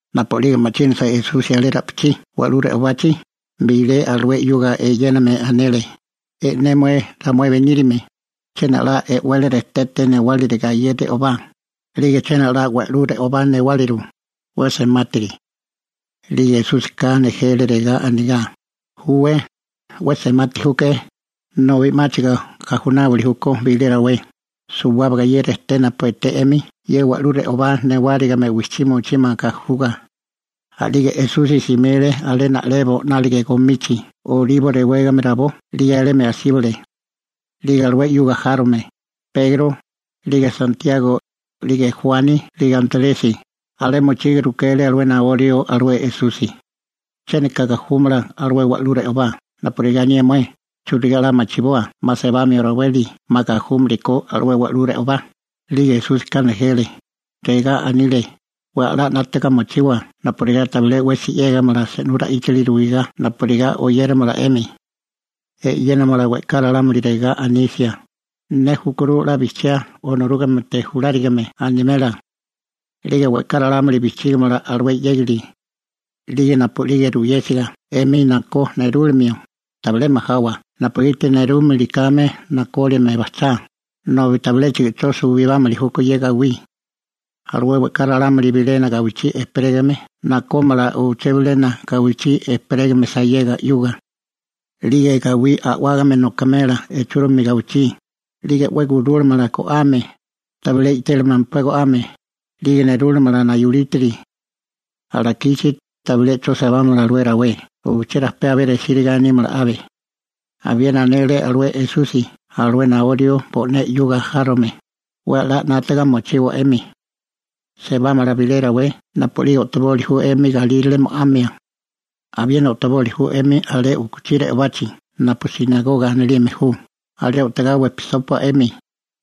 Napu'lige ma'chínasa Esusi alé ra'pichí wa'lú re'obachi, bilé alué 'yuga eyéname anele: ―E'né mué, ramué beníriame, ¡chiena 'la e'wele rejtete newáriliga ye re'obá, 'lige chiena 'la wa'lú re'obá newáliru, 'we semátiri! 'Lige Esúsika nejele regá anigá: ―Júwé, 'we semati júke'é, nobi 'máchigo gajunáwili júkó bilé rawé, suwábaga ye rejté napu eté 'emi ye wa'lú re'obá newárigime wijchí mochímala gajuga. A'lige Esusi simile alé na'lebo 'nálige gomichi Olibo rewégame rabó 'lige alemi asíbale. 'Lige alué 'yuga járome Pegro, 'lige Santiago, 'lige Juani 'lige Antresi, alé mochiga rukele alué naó rió alué Esusi: ―¿Chiéniko gajúmala alué wa'lú re'obá napurigá anié mué? ¿Churigá 'la machiboa 'ma sebamio raweli 'ma gajúmili ko alué wa'lú re'obá? 'Lige Esúsika nejele, regá anile: ―'We a'lá 'nátaga mochiwa napurigá tabilé 'wesi 'yégamala se'nú ra'íchili ruigá napurigá oyéramala 'emi. E'yénamala we'ká ralámuli regá anisia: «Ne júkuru 'la bijchiá Onorúgamete julárigame», animela. › 'Lige we'ká ralámuli bijchígimala alué 'yégali. 'Lige napu'lige ruyésiga 'emi nakó nerúlimio, tabilé majawa napugiti nerúlimili kame nakólime bajchá, nobi tabiléchigo 'cho suwibámili júkó ye gawí. Alué we'ká ralámuli bilena gawichí ejperégame nakómala uché bilena gawichí ejperégame sayega 'yuga. 'Lige gawí a'wágame nokamela ichúrimi gawichí, 'lige 'we gurúlamala go'ame, tabilé i'télimempá go'ame, 'lige nerúlamala naulítiri. Alakichi, tabilé 'cho sebámala aleké rawé, uché rajpé resíriga nímala abe. Abiena anele alué Esusi alué naó rió bo'né 'yuga járome: ―'We a'lá 'nátaga mochiwa 'emi. Sebámala bilé rawé napu a'lige o'toboli ju 'emi galírale mo'amia. Abiena o'toboli ju 'emi alé u'kuchí re'obachi napu «sinagoga» anilime ju, alé o'togá wejpisópua 'emi,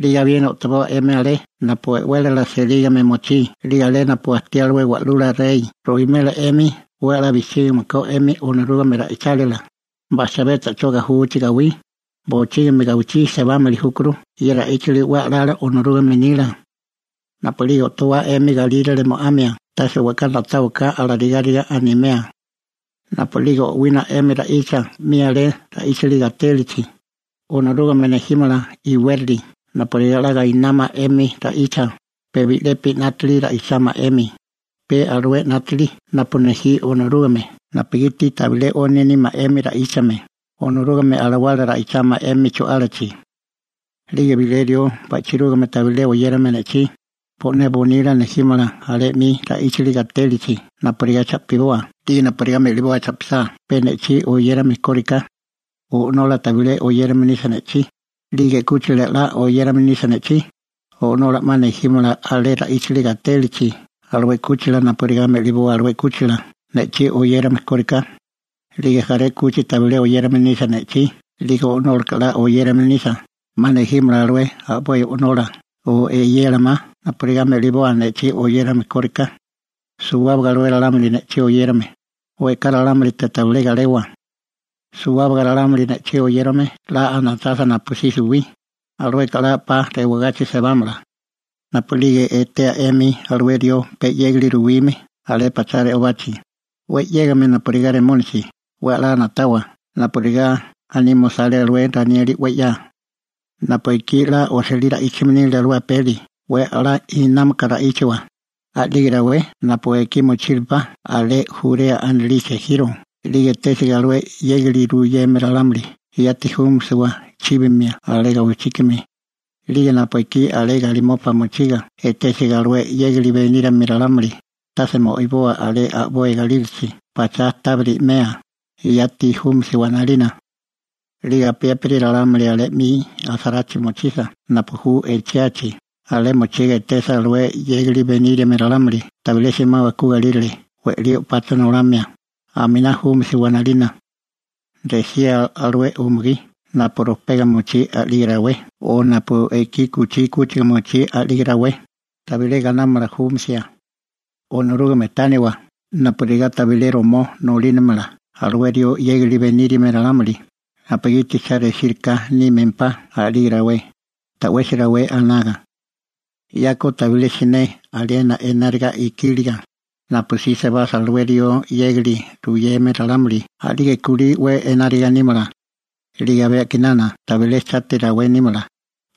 'lige abiena o'toboa 'emi alé napu e'wélala selígame mochí 'lige alé napu ajtí alué wa'lula rey ruwimela 'emi 'we a'lá bijchígime ko 'emi Onorúgame ra'ichálila. Bajchibé ta'chó gajuchi gawí, bochígimi gawichí sebámili júkuru ye ra'íchili 'we a'lala Onorúgame nila. Napu'lige o'towá 'emi galírale mo'amia, tase we'ká na'táwaká alarigáriga animea. Napu'lige o'wina 'emi ra'icha 'mi alé ra'íchili gatélichi, Onorúgame nejímala iwérali napurigá 'la gainámala 'emi ra'icha, pe bi'lepi 'nátili ra'ichámala 'emi, pe alué 'nátili napu nejí Onorúgame napugiti tabilé 'oni nímala 'emi ra'íchame, Onorúgame Alawala ra'ichámala 'emi chu'álachi. 'Lige bilé rió ba'chirúgame tabilé oyérame ne'chí, bo'né bonila nejímala alé 'mi ra'íchili gatélachi napurigá cha'piboa 'lige napurigá me'liboa cha'pisá pe ne'chí oyérame kóriká. O'nola tabilé oyérame nisa ne'chí, 'lige 'kúchila 'la oyérame nisa ne'chí, o'nola 'ma nejímala alé ra'íchili gatélachi alué 'kúchila napurigá me'liboa alué 'kúchila ne'chí oyérame kóriká. 'Lige jaré 'kuchi tabilé oyérame nisa ne'chí 'lige o'nólaka 'la oyérame nisa, 'ma nejímala alué a'boi o'nola o eyela ma napurigá me'liboa ne'chí oyérame kóriká. Suwábaga alué ralámuli ne'chí oyérame, we'ká ralámulite tabilé galewa. Suwábaga ralámuli ne'chí oyérame 'la anachasa napusí suwí, alueka 'la 'pa rewagachi sebámala. › Napu'lige etea 'emi alué rió pe 'yégali ruwime alé pachá re'obachi, 'we 'yégame napurigá Remónisi, 'we a'lá na'tawa napurigá anime osale alué Ranieli 'we 'ya. Napu ekí 'la osilí ra'íchame nile alué apeli 'we a'lá inámaka ra'íchawa. A'lige rawé napu ekí mochírupá alé Jurea anilichi ejiro 'lige etésiga alué 'yégali ruyeme ralámuli yati júmisiwa chíbimia alé gawichíkami. 'Lige napu ekí alé galimopa mochiga etésiga alué 'yégali beníriame ralámuli, tase mo'iboa alé a'boi galílachi pachá tábiri 'mea, yati júmisiwa 'nalina. 'Lige apiépiri ralámuli alé 'mi asarachi mochisa napu ju echiachi, alé mochiga etesa alué 'yégali beníriame ralámuli tabilé simawa ku galírale we'lí o'pacha nolamia, aminá júmisiwa 'nalina. ¡Resía alué umugí napu rojpega mochí a'lige rawé o napu ekí u'kuchí 'kúchiga mochí a'lige rawé, tabilé gainámala júmasia! Onorúgame tániwa napurigá tabilé romó nolínamala alué rió 'yégali beníriame ralámuli, napugiti cha resíriká nímempá a'lige rawé, ta'wesi rawé anaga. 'Yako tabilé siné aliena enárigá nile, napusí sebasa alué rió 'yégali ruyeme ralámuli a'lige kulí 'we enárigá nímala. 'Lige abé a'kinana tabilé enárigá nímala.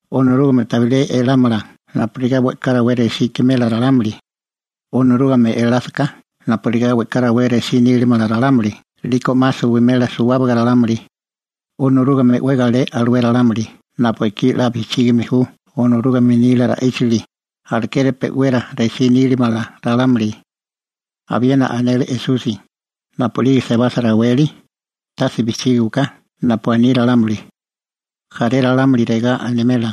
Onorúgame tabilé elámala napurigá we'ká rawé resí ikimela ralámuli. Onorúgame elásaká napurigá we'ká rawé resí nílamala ralámuli 'liko 'ma suwimela suwábaga ralámuli. Onorúgame 'we galé alué ralámuli napu ekí 'la bijchígame ju Onorúgame nila ra'íchili, alekeri pe'wera resí nílimala ralámuli. Abiena anele Esusi: ―Napu'lige sebasa raweli, tase bijchígiwaká napu aní ralámuli. Jaré ralámuli regá animela: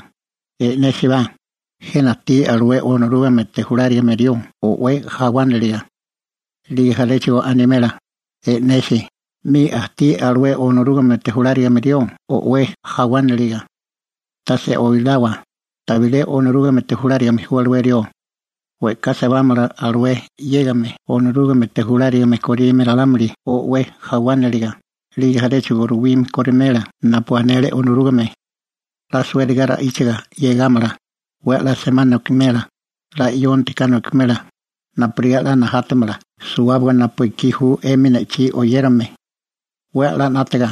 «E'nésibá, jena ajtí alué Onorúgamete julárigame rió o'wé jawániliga.» 'Lige jaréchigo animela: «E'nesi, 'mi ajtí alué Onorúgamete julárigame rió o'wé jawániliga.» Tase oilawa, tabilé Onorúgamete julárigame ju alué rió. We'ká sebámala alué 'yégame Onorúgamete julárigame korime ralámuli o'wé jawániliga, 'lige jaréchigo ruwime korimela napu anele Onorúgame. 'La suériga ra'íchiga 'yegámala, 'we a'lá semá nokimela, 'la 'yonti ka nokimela, napurigá 'la najátamala suwábaga napu ju 'emi ne'chí oyérame. 'We a'lá 'nátaga,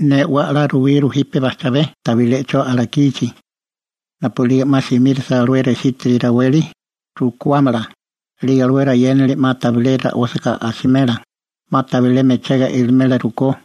ne 'we a'lá ruwíguru jipe bajchabé tabilé 'cho alakichi. › Napu'lige 'ma simírisa alué resítiri raweli, rukuámala, 'lige alué rayénali 'ma tabilé ra'ósiga asimela, 'ma tabilé mechega ilimela rukó,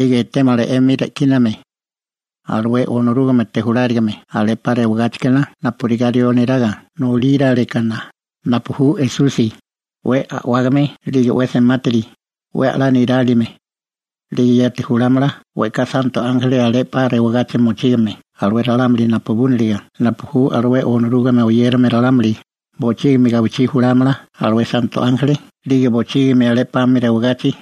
A'lige etémala 'emi re'kíname alué Onorúgamete julárigame alé 'pa rewagáchikana napurigá rió neraga nolíralekana (napu ju Esusi), 'we a'wágame 'lige 'we semátiri, 'we a'lá nirálime. 'Lige yati julámala we'ká santo ánjeli alé 'pa rewagachi mochígame alué ralámuli napubúniliga napu ju alué Onorúgame oyérame ralámuli, bochígimi gawichí julámala alué santo ánjeli 'lige bochígimi alé 'pami rewagachi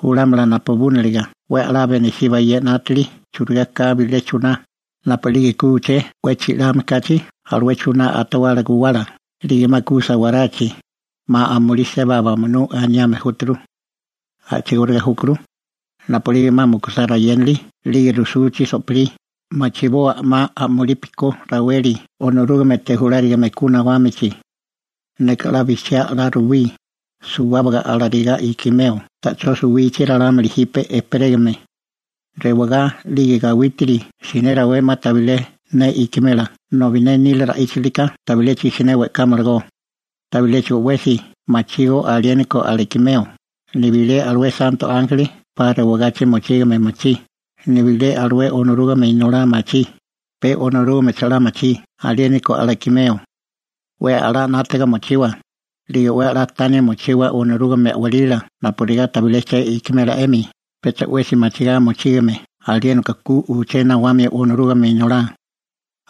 julámala napubúniliga. › 'We a'lá benisíbá ye 'nátili churigá ka bilé chuná: Napu'lige ku uché 'we chi'lame kachi alué chuná atawala guwala, 'lige 'ma ku sawarachi, «'ma amulí seba bamunú» aniame júturu. A'chigóriga júkuru, napu'lige 'ma mukusá rayénali 'lige rujsuchi so'pilí, machiboa 'ma a'mulipi ko raweli Onorúgamete Julárigame ku nawámichi. Neka 'la bijchiá 'la ruwí, suwábaga alarigá ikimeo ta'chó suwichi ralámuli jipe ejperégame. Rewagá 'lige gawítiri siné rawé 'ma tabilé ne ikimela nobi ne nila ra'íchalika tabiléchigo siné we'kámalagó. › Tabiléchigo 'wesi machígó aliéniko alakimeo, nibilé alué santo ánjeli 'pa rewagachi mochígame machí, nibilé alué Onorúgame Inolá machí, pe Onorúgamecho 'la machí aliéniko alakimeo. › 'We a'lá 'nátaga mochiwa, 'lige 'we a'lá tania mochiwa Onorúgame a'walila napurigá tabilé che ikimela 'emi, pecha 'wesi machigá mochígame aliéniko ku uché nawamio Onorúgame Inolá.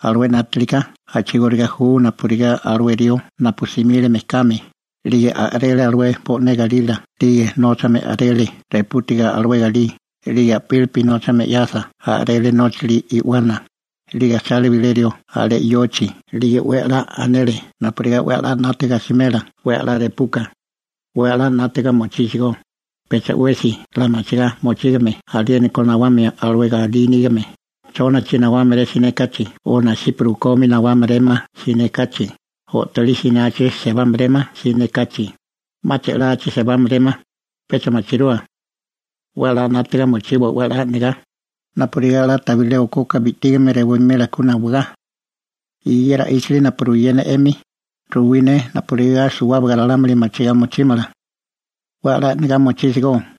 Alué 'nátilika a'chigóriga ju napurigá alué rió napu simile mejkami, 'lige a'rele alué bo'né galila 'lige nóchame a'rele repútiga alué galí, 'lige a'pílipi nóchame 'yasa a'rele nóchali i'wana, 'lige ajchale bilé rió alé yochi 'lige 'we a'lá anele napurigá 'we a'lá 'nátaga asimela 'we a'lá repuka. 'We a'lá 'nátaga mochísigó, pecha 'wesi 'la machigá mochígame aliéniko nawamio alué galí nígame, chónachi nawámaré siné kachi o nasipa rukomi nawámaréma siné kachi, o'tolí sinachi sebámaréma siné kachi, 'ma che'lachi sebámaréma, pecha machirua. 'We a'lá 'nátaga mochiwa 'la e'negá, napurigá 'la tabilé okoka bi'tígame rewimela ku nawagá. Ye ra'íchili napu ruyé ne 'emi, ruwí ne napurigá suwábaga ralámuli machigá mochímala. ¡'We a'lá e'negá mochísigó!